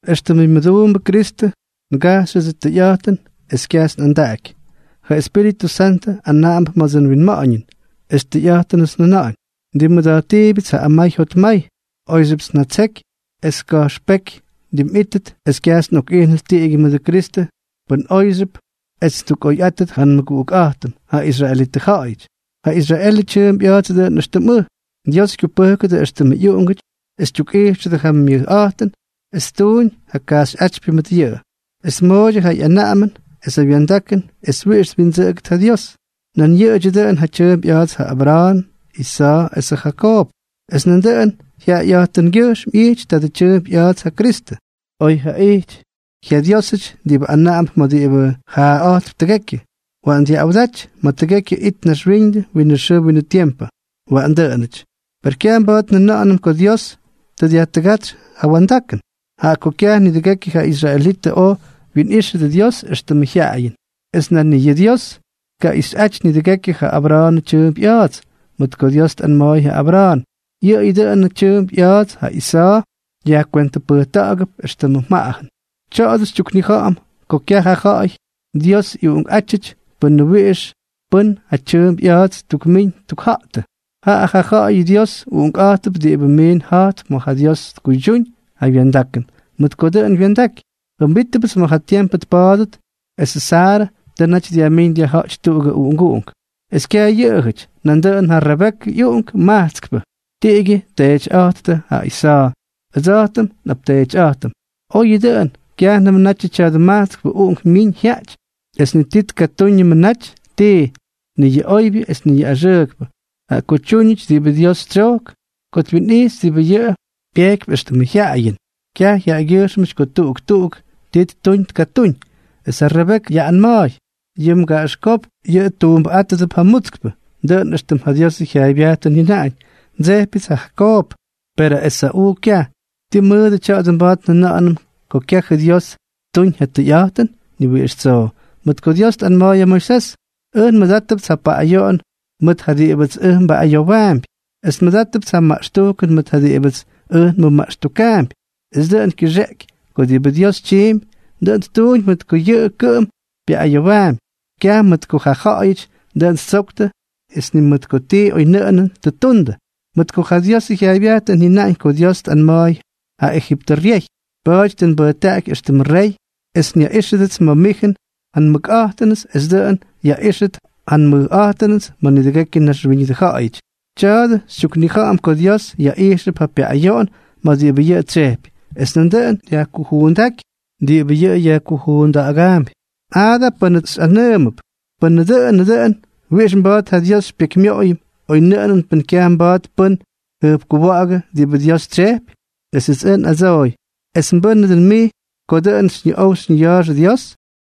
Extʉmʉ myʉduumbʉ Kristʉ, ngajxyʉdsʉ tʉyꞌa̱jtʉn es kyajts nꞌandaꞌaky. Ja Espíritʉ Santʉ anaꞌamp ma̱dsʉ nwinma̱ꞌa̱ñʉn es tʉyꞌa̱jtʉnʉts njʉna̱ꞌa̱ñ. Ndimmʉda̱jttiibyʉts ja amay jotmay. Oyxyʉpts njatseky es ka̱jxpéky ndimꞌítʉt es kyajts nꞌokꞌijnʉt tiꞌigyʉ mʉdʉ Kristʉ pʉn oꞌoyʉpxyʉp es ttukꞌoyꞌáttʉt ja nmʉguꞌukꞌa̱jtʉm, ja israelitʉ ja̱ꞌa̱yʉty, ja Israelʉ tyʉʉmp ꞌya̱a̱ts dʉꞌʉn éxtʉm ʉj. Dios kyupʉjkʉdʉ éxtʉmʉ ꞌyuꞌungʉty es tyukꞌijxʉdʉ ja myʉjꞌa̱jtʉn es ttuuñ ja kajxyꞌátypyʉ mʉt yʉꞌʉ, es tmooydyʉ ja ꞌyanaꞌamʉn esʉ wya̱ndakʉn es wiꞌix twindsʉꞌʉgʉdʉt ja Dios. Nan yʉꞌʉdyʉ dʉꞌʉn ja tyʉʉmp ꞌya̱a̱ts ja Abra̱a̱n, Isa̱a̱ esʉ Jakoob, es nandʉꞌʉn jyaꞌayꞌa̱jtʉngyʉjxm ꞌyijty tadʉ tyʉʉmp ꞌya̱a̱ts ja Kristʉ, oy jaꞌijty jyaDiósʉty diꞌibʉ anaꞌamp ma̱ diꞌibʉ jaaꞌa̱jtp tʉgekyʉ. ¡Waꞌan dyaꞌꞌawdaty ma̱ tʉgekyʉ it naxwíñʉdʉ winʉ xʉʉ winʉ tiempʉ! Waꞌan dʉꞌʉnʉty. ¡Per kyaj mba̱a̱t njʉna̱ꞌa̱nʉm ko Dios tʉ dyajtʉgátsy ja wya̱ndakʉn! Jaꞌa ko kyaj nidʉgekyʉ yʉ israelítʉty oj wyinꞌíxʉdʉ Dios éxtʉmʉ jyaꞌayʉn. Es nan ni yʉꞌʉ Dios tkaja̱ꞌa̱yꞌáty nidʉgekyʉ ja Abra̱a̱nʉ tyʉʉmp ꞌya̱a̱dsʉty, mʉt ko Dios tꞌanma̱a̱y ja Abra̱a̱n: “Yʉꞌʉyʉ dʉꞌʉnʉ tyʉʉmp ꞌya̱a̱ts ja Isa̱a̱ yajkwentʉpʉjta̱ꞌa̱gʉp éxtʉm mjaꞌajʉn.” Tya̱a̱dʉ xytyuknija̱ꞌa̱m ko kyaj ja ja̱ꞌa̱y Dios ꞌyuꞌunkꞌátyʉty pʉnʉ wiꞌix pʉ́n ja tyʉʉmp ꞌya̱a̱ts ttukmíñ ttukja̱jtʉ, jaꞌa ja ja̱ꞌa̱y Dios uꞌunkꞌa̱jttʉp diꞌibʉ miin ja̱jttʉ ma̱ ja Dios tkuydyúñ ja wya̱ndakʉn, mʉt ko dʉꞌʉn wya̱ndaky: “Jʉmbítʉpts ma̱ ja tiempʉ tpa̱a̱dʉt esʉ Saarʉ tʉ naty dyajmín dyajja̱ꞌty tuꞌugʉ uꞌunguꞌunk.” Es kyaj yʉꞌʉyʉty, nandʉꞌʉn ja Rebekʉ ꞌyuꞌunk majtskpʉ, tiꞌigyʉ tteetyꞌa̱jttʉ ja Isa̱a̱, ʉdsa̱jtʉm nꞌapteetyꞌa̱jtʉm. Oyʉ dʉꞌʉn, kyajnʉm natyʉ tya̱dʉ majtskpʉ uꞌunk myiñ jyaꞌty es ni tkatúñʉmʉ naty tii, ni yʉ oybyʉ es ni yʉ axʉʉkpʉ, jaꞌa ko tyúñʉty diꞌibʉ Dios tsyojk ko twinꞌijxy diꞌibʉ yʉꞌʉ kyupejkypy éxtʉmʉ jyaꞌayʉn, kyaj jaꞌagyʉjxm ko tuꞌuk tuꞌuk tii ttuñ tkatúñ, es ja Rebekʉ yaꞌꞌanma̱a̱y: “Yʉ mgaꞌaxkópk yʉꞌʉ tuumbʉꞌátʉdʉp ja mutskpʉ.” Dʉꞌʉn éxtʉm ja Diosʉ jyaaybyajtʉn jyʉnaꞌañ: “Ndsejpyʉts ja Jakoob, perʉ Esa̱ꞌuu kyaj.” ¿Tii mʉdʉ tya̱a̱dʉ mba̱a̱t njʉna̱ꞌa̱nʉm ko kyajʉ Dios ttuñ ja tʉyꞌa̱jtʉn? ¡Ni wiꞌix tsoo! Mʉt ko Dios tꞌanma̱a̱y ja Moisés: “Ʉj nmʉdátʉpts ja paꞌꞌayoꞌon mʉt ja diꞌibʉts ʉj nbaꞌꞌayowaampy, es nmʉdátʉpts ja maꞌxtujkʉn mʉt ja diꞌibʉts ʉj nmʉmaꞌxtukaampy.” Es dʉꞌʉn kyʉxeꞌeky ko diꞌibʉ Dios tyiimpy, dʉꞌʉn ttuñ mʉt ko yʉꞌʉ kʉꞌʉm pyaꞌꞌayowaampy, kyaj mʉt ko ja ja̱ꞌa̱yʉty dʉꞌʉn ttsoktʉ es ni mʉt ko ti oynʉꞌʉnʉn tʉ ttundʉ. Mʉt ko ja Diosʉ jyaaybyajtʉn jyʉnaꞌañ ko Dios tꞌanma̱a̱y ja Ejiptʉ ryey: “Pa̱a̱ty tʉ nbʉjtaꞌaky éxtʉmʉ rey es nyaꞌíxʉdʉts ma̱ mijʉn ja nmʉkꞌa̱jtʉnʉts es dʉꞌʉn yaꞌíxʉt ja nmʉjꞌa̱jtʉnʉts ma̱ nidʉgekyʉ naxwíñʉdʉ ja̱ꞌa̱yʉty.” Tya̱a̱dʉ xytyuknija̱ꞌa̱m ko Dios yaꞌijxʉp ja pyaꞌꞌayoꞌon ma̱ diꞌibʉ yʉꞌʉ tsyejpy, es nandʉꞌʉn dyajkujuundaꞌaky diꞌibʉ yʉꞌʉ yajkujuunda̱ꞌa̱gaampy. Jaa da pʉ́nʉts xyꞌanʉʉmʉp: “Pʉn dʉꞌʉnʉ dʉꞌʉn, ¿wiꞌix mba̱a̱t ja Dios xypyekymyoꞌoyʉm oynʉꞌʉnʉn pʉn kyaj mba̱a̱t pʉ́n tjʉjpkuwa̱ꞌa̱gʉ diꞌibʉ Dios tsyejpy?” Esʉts ʉj nꞌadsoy: ¿Es mbʉ́nʉ dʉn mij ko dʉꞌʉn xyñiꞌow xyñiya̱a̱xʉ Dios?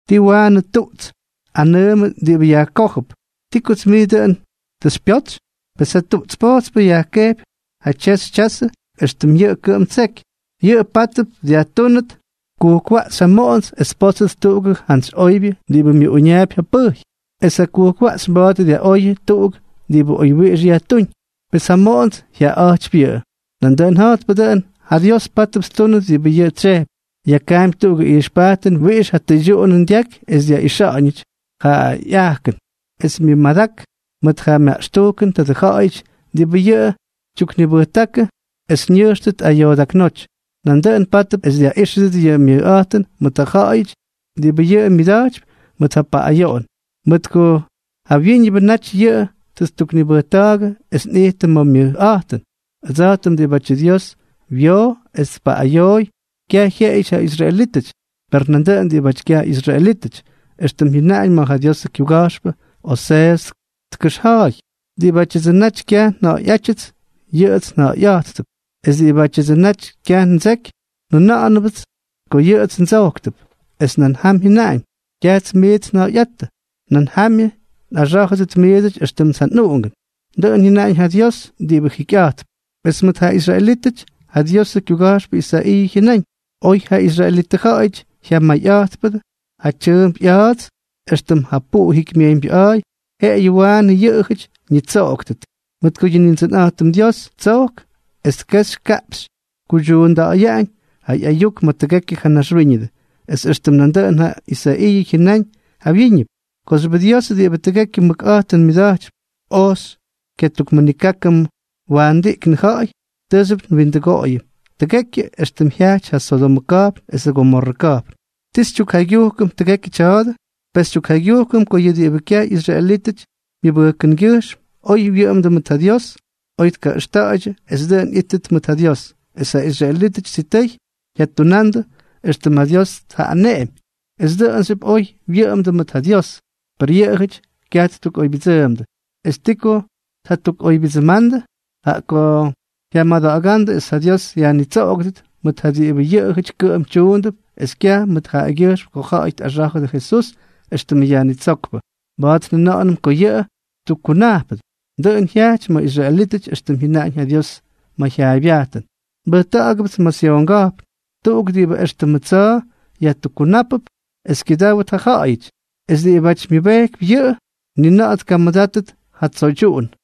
¿Tii waꞌanʉ tuꞌts tꞌanʉʉmʉ diꞌibʉ yajkójʉp: “Ti kots mij dʉꞌʉn tʉ xypyotsy?” Pes ja tuꞌts pojtspʉ yajkejpy ja tyexy tyazʉ éxtʉm yʉꞌʉ kʉꞌʉm ttseky. Yʉꞌʉ pátʉp dyajtúnʉt kujkwaꞌxy ja moꞌonts es tpótsʉt tuꞌugʉ jantsy oybyʉ diꞌibʉ myʉꞌuñaapy ja pʉjy, es jakujkwaꞌxy mba̱a̱t dyaꞌoyʉ tuꞌuk diꞌibʉ oywyiꞌix yajtúñ. Pes ja moꞌonts jyaꞌaꞌa̱jtypy yʉꞌʉ. Nandʉꞌʉn ja̱jtpʉ dʉꞌʉn, ja Dios pátʉp ttúnʉt diꞌibʉ yʉꞌʉ tsyejpy. Yakaampy tuꞌugʉ ijxpajtʉn wiꞌix ja tʉydyuꞌunʉn dyaky es dyaꞌixa̱ꞌa̱ñʉty ja ꞌyajkʉn es myʉmadak mʉt ja myaꞌxtujkʉnʉ tadʉ ja̱ꞌa̱yʉty diꞌibʉ yʉꞌʉ tyuknibʉjtákʉ es ñʉjxtʉt ayoodaknóty. Nandʉꞌʉn pátʉp es dyaꞌíxʉdʉt yʉ myʉjꞌa̱jtʉn mʉt ja ja̱ꞌa̱yʉty diꞌibʉ yʉꞌʉ myʉda̱jtypy mʉt ja paꞌꞌayoꞌon, mʉt ko jawyíñʉbʉ naty yʉꞌʉ tʉ ttuknibʉjta̱a̱gʉ es nꞌijtʉm ma̱ myʉjꞌa̱jtʉn, ʉdsa̱jtʉm, diꞌibátyʉ Dios wyoo es tpaꞌꞌayooy, kyaj jyeꞌeyʉty ja israelítʉty, per nandʉꞌʉn diꞌibʉty kyaj ꞌyisraelítʉty. Extʉm jyʉnaꞌañ ma̱ ja Diosʉ kyuga̱jxpʉ Oseeʉs tkʉxja̱a̱y: Diꞌibátyʉdsʉ naty kyaj nja̱ꞌa̱yꞌátyʉts, yʉꞌʉts nja̱ꞌa̱yꞌáttʉp, es diꞌibátyʉdsʉ naty kyaj ndseky, njʉna̱ꞌa̱nʉpts ko yʉꞌʉts ndsojktʉp. Es nan jam jyʉnáñ: “Kyajts miits nja̱ꞌa̱yꞌáttʉ, nan jamyʉ nꞌaxá̱jʉdʉt miidsʉty éxtʉmts ja nꞌuꞌungʉn”, dʉꞌʉn jyʉnaꞌañ ja Dios diꞌibʉ jikyꞌa̱jtp. Es mʉt ja israelítʉty, ja Diosʉ kyuga̱jxpʉ Isaiiʉ jyʉnáñ: “Oy ja israelitʉ ja̱ꞌa̱yʉty jyamayꞌa̱jtpʉdʉ ja tyʉʉmp ꞌya̱a̱dsʉty éxtʉm ja puꞌu jikymyejyñbyʉꞌa̱a̱y, jeꞌeyʉ waanʉ yʉꞌʉjʉty ñitsoꞌoktʉt. Mʉt ko yʉ Nindsʉnꞌa̱jtʉm Dios tsojk es kexy kaꞌpxy tkuydyuunda̱ꞌa̱yaꞌañ yʉ ꞌyayuk ma̱ tʉgekyʉ ja naxwíñʉdʉ.” Es éxtʉm nandʉꞌʉn ja Isaiiʉ jyʉnáñ jawyíñʉp: Kooxyʉbʉ Dios diꞌibʉ tʉgekyʉ mʉkꞌa̱jtʉn myʉda̱jtypy, oj xykyatukmʉnikákʉm waandiꞌknʉ ja̱ꞌa̱y, tʉʉxyʉp ndimkutʉgoꞌoyʉm tʉgekyʉ, éxtʉm jyajty ja Sodomʉ ka̱jpn esʉ Gomorrʉ ka̱jpn. ¿Ti xytyukjaygyujkʉm tʉgekyʉ tya̱a̱dʉ? Pes xytyukjaygyujkʉm ko yʉ diꞌibʉ kyaj ꞌyisraelítʉty myʉbʉjkʉngyʉjxm oy wyʉꞌʉmdʉ mʉt ja Dios oy tkaꞌʉxta̱a̱ydyʉ es dʉꞌʉn ꞌyíttʉt mʉt ja Dios, es ja israelítʉty sitʉy jyatunandʉ éxtʉm ja Dios tꞌaneꞌemy es dʉꞌʉnxyʉp oy wyʉꞌʉmdʉ mʉt ja Dios, per yʉꞌʉjʉty kyaj ttukꞌoybyʉdsʉʉmdʉ. ¿Es ti ko tkatukꞌoybyʉdsʉʉmdʉ? Jaꞌa ko jyamada̱ꞌa̱gándʉ es ja Dios yajnitsoꞌogʉdʉt mʉt ja diꞌibʉ yʉꞌʉjʉty kʉꞌʉm tyuundʉp es kyaj mʉt jaꞌagyʉjxm ko ja̱ꞌa̱y tꞌaxá̱jʉdʉ Jesús éxtʉmʉ Yajnitsókpʉ, mba̱a̱t njʉna̱ꞌa̱nʉm ko yʉꞌʉ tyukkunajpʉdʉ. Dʉꞌʉn jyajty mʉdʉ israelítʉty éxtʉm jyʉnaꞌañ ja Dios ma̱ ja jyaaybyajtʉn: Nbʉjta̱ꞌa̱gʉpts ma̱ Syon ka̱jpn, tuꞌuk diꞌibʉ éxtʉmʉ tsa̱a̱ yajtukkunápʉp es kyʉdáwdʉt ja ja̱ꞌa̱yʉty; es diꞌibáty myʉbejkypy yʉꞌʉ, ni na̱ꞌa̱ tkamʉdáttʉt ja tsoydyuꞌun.